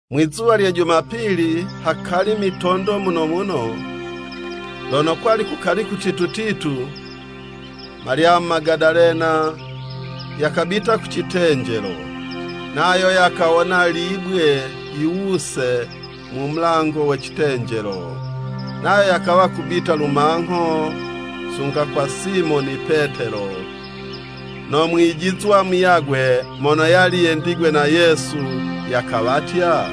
Mwizuwa lye jumapili, hakali mitondo muno muno, lono kwali kukali kutitu titu, Malyamu Magadalena yakabita ku citenjelo, nayo yakawona libwe yiwuse mu mulango we citenjelo. Nayo yakawa kubita lumangho sunga kwa Simoni Petelo, no mwijizwa muyagwe mono yali yendigwe na Yesu, yakawatya,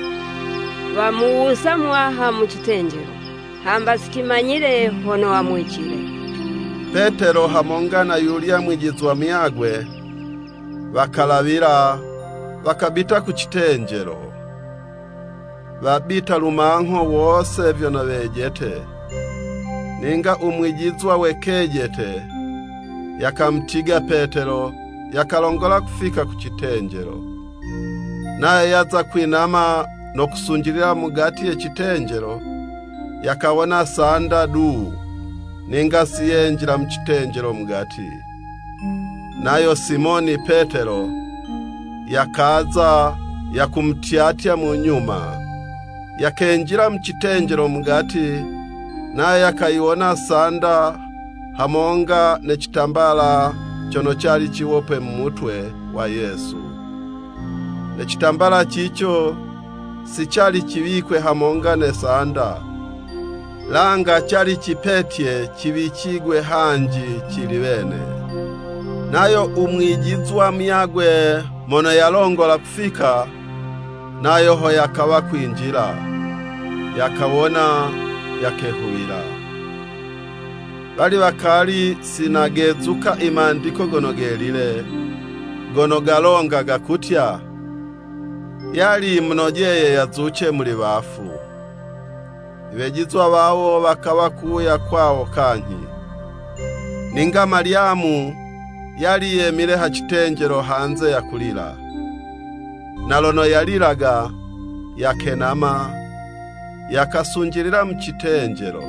“Wamuwusa Muwaha mu citenjelo, hamba si cimanyile hono wamuwicile.” Petelo hamonga na yuyulya mwijizwa muyagwe, wakalawila, wakabita ku citenjelo. Wabita lumangho wose vyono wejete, ninga u mwijizwa we kejete, yakamutiga Petelo, yakalongola kufika ku citenjelo. Nayo yaza kwinama no kusunjilila mugati ye citenjelo, yakawona sanda du, ninga si yenjila mu citenjelo mugati. Nayo Simoni Petelo yakaza, yakumutyatya mu nyuma, yakenjila mu citenjelo mugati, nayo yakayiwona sanda hamonga, ne citambala cono cali ciwopwe mu mutwe wa Yesu. Ne citambala cico si cali ciwikwe hamonga ne sanda, langa cali cipetye, ciwicigwe hanji cili wene. Nayo u mwijizwa muyagwe mono yalongola kufika, nayo ho yakawa kwinjila, yakawona, yakehuwila. ( Wali wakali si nagezuka i Mandiko Gono Gelile, gono galonga gakutya, “Yali yimunojeye yazuce muli wafu.”) Iwejizwa wawo wakawa kuwuya kwawo kanyhi. Ninga Malyamu yali yemile ha citenjelo hanze yakulila, na lono yalilaga, yakenama, yakasunjilila mu citenjelo,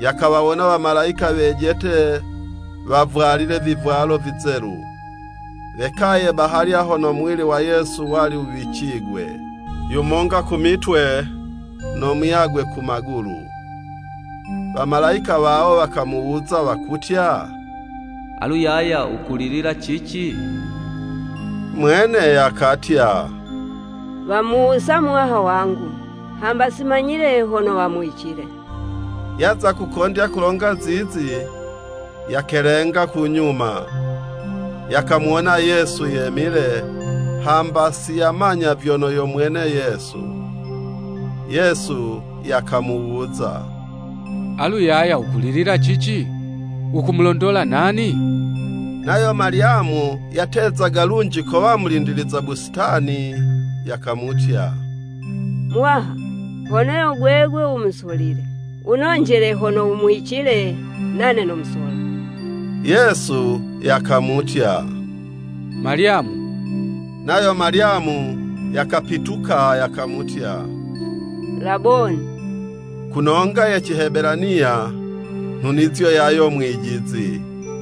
yakawawona wamalayika wejete wavwalile vivwalo vizelu, wekaye bahalya hono muwili wa Yesu wali wuwicigwe, yumonga ku mitwe, no muyagwe ku magulu. Wamalayika wawo, wakamuwuza wakutya, “Alu yaya wukulilila cici?” Mwene yakatya, “Wamuwusa Muwaha wangu, hamba simanyile hono wamuwicile!” Yaza kukondya kulonga zizi, yakelenga ku nyuma, yakamuwona Yesu yemile, hamba si yamanya vyono yo mwene Yesu. Yesu yakamuwuza “Alu yaya wukulilila cici? Wukumulondola nani?” Nayo Malyamu, yatezaga lunji kowa yo mulindiliza busitani, yakamutya, “Muwaha, hono yo gwegwe wumusolile, wunonjele hono wumuwicile, nane nomusola.” Yesu yakamutya, “Malyamu!” Nayo Malyamu yakapituka, yakamutya, “Laboni!” ku nonga ye Cihebelaniya, (nhunizo yayo “Mwijizi.”)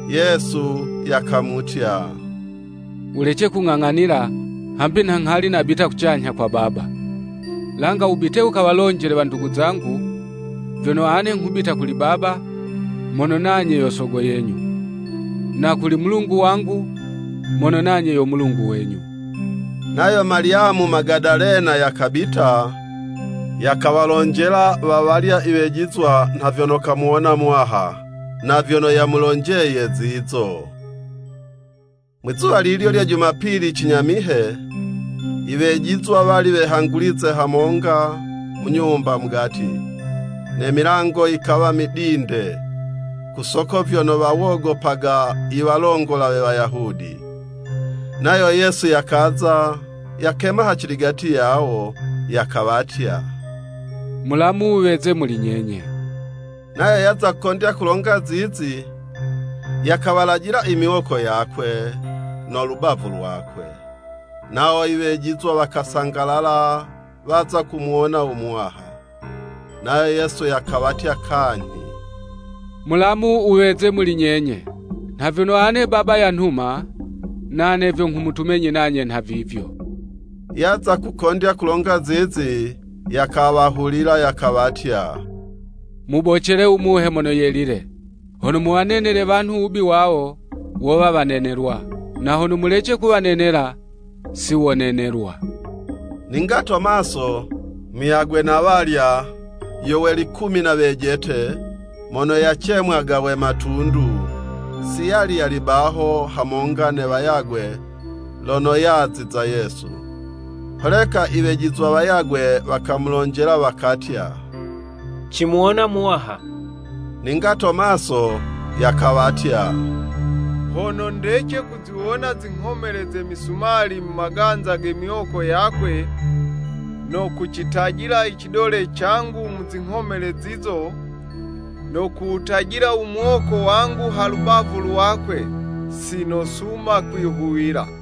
Yesu yakamutya, “Wulece kung'ang'anila, hambi nha nghali nabita kucanyha kwa Baba. Langa wubite wukawalonjele wandugu zangu, vyono ane nghubita kuli Baba, mono nanye yo Sogo yenyu, na kuli Mulungu wangu, mono nanye yo Mulungu wenyu.” Nayo Malyamu Magadalena yakabita, yakawalonjela wa walya iwejizwa nha vyono kamuwona Muwaha, na vyono yamulonjeye zizo. Mwizuwa lilyo lye jumapili cinyamihe, iwejizwa wali wehangulize hamonga mu nyumba mugati, ne milango yikawa midinde, ku soko vyono wawogopaga iwalongola we Wayahudi. Nayo Yesu yakaza, yakema haciligati yawo, yakawatya, “Mulamu wuweze muli nyenye.” Nayo yaza kukondya kulonga zizi, yakawalajila imiwoko yakwe, no lubavu lwakwe. Nawo iwejizwa wakasangalala waza kumuwona u Muwaha. Nayo Yesu yakawatya kanyhi, “Mulamu wuweze muli nyenye. Nha vyono ane Baba yanhuma, nane vyo nghumutumenyi nanye nhavivyo.” Yaza kukondya kulonga zizi, yakawahulila, yakawatya, “Mubocele u Muhe Mono Yelile. Hono muwanenele wanhu wubi wawo, wowa wanenelwa, na hono mulece kuwanenela, si wonenelwa.” Ninga Tomaso, muyagwe na walya, yo we likumi na wejete, (mono yacemwaga we Matundu,) si yali yali baho hamonga ne wayagwe lono yaziza Yesu. Holeka iwejizwa wayagwe wakamulonjela wakatya, “Cimuwona Muwaha.” Ninga Tomaso yakawatya, “Hono ndece kuziwona zinghomele ze misumali mu maganza ge miwoko yakwe, no kucitajila icidole cangu mu zinghomele zizo, no kuwutajila umuwoko wangu ha lubavu lwakwe, si nosuma kwihuwila.”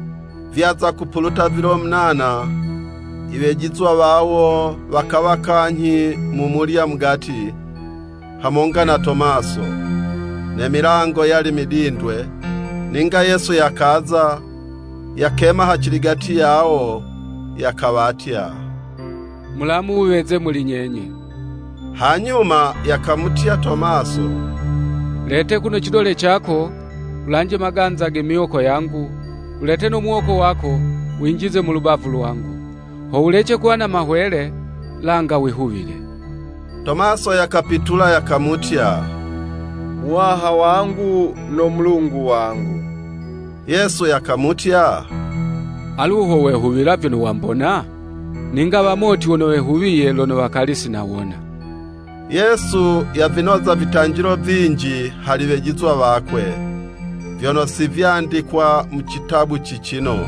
Vyaza kupuluta vilo munana, iwejizwa wawo wakawa kanyhi mumulya mugati, hamonga na Tomaso. Ne milango yali midindwe, ninga Yesu yakaza, yakema ha ciligati yawo, yakawatya, “Mulamu wuweze muli nyenye.” Hanyuma yakamutya Tomaso “Lete kuno cidole cako, wulanje maganza ge miwoko yangu, wulete no muwoko wako, winjize mu lubavu lwangu. Ho wulece kuwa na mahwele, langa wihuwile!” Tomaso yakapitula yakamutya, “Muwaha wangu no Mulungu wangu!” Yesu yakamutya, “Alu ho wehuwila vyono wambona? Ninga wamoti wono wehuwiye, lono wakali si nawona.” Yesu yavinoza vitanjilo vinji hali wejizwa wakwe, vyono si vyandikwa mu citabu cicino.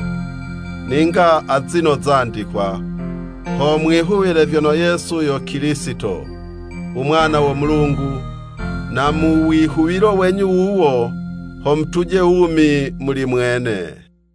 Ninga azino zandikwa, ho mwihuwile vyono Yesu yo Kilisito, u Mwana wo Mulungu, na mu wihuwilo wenyu wuwo, ho mutuje wumi muli mwene.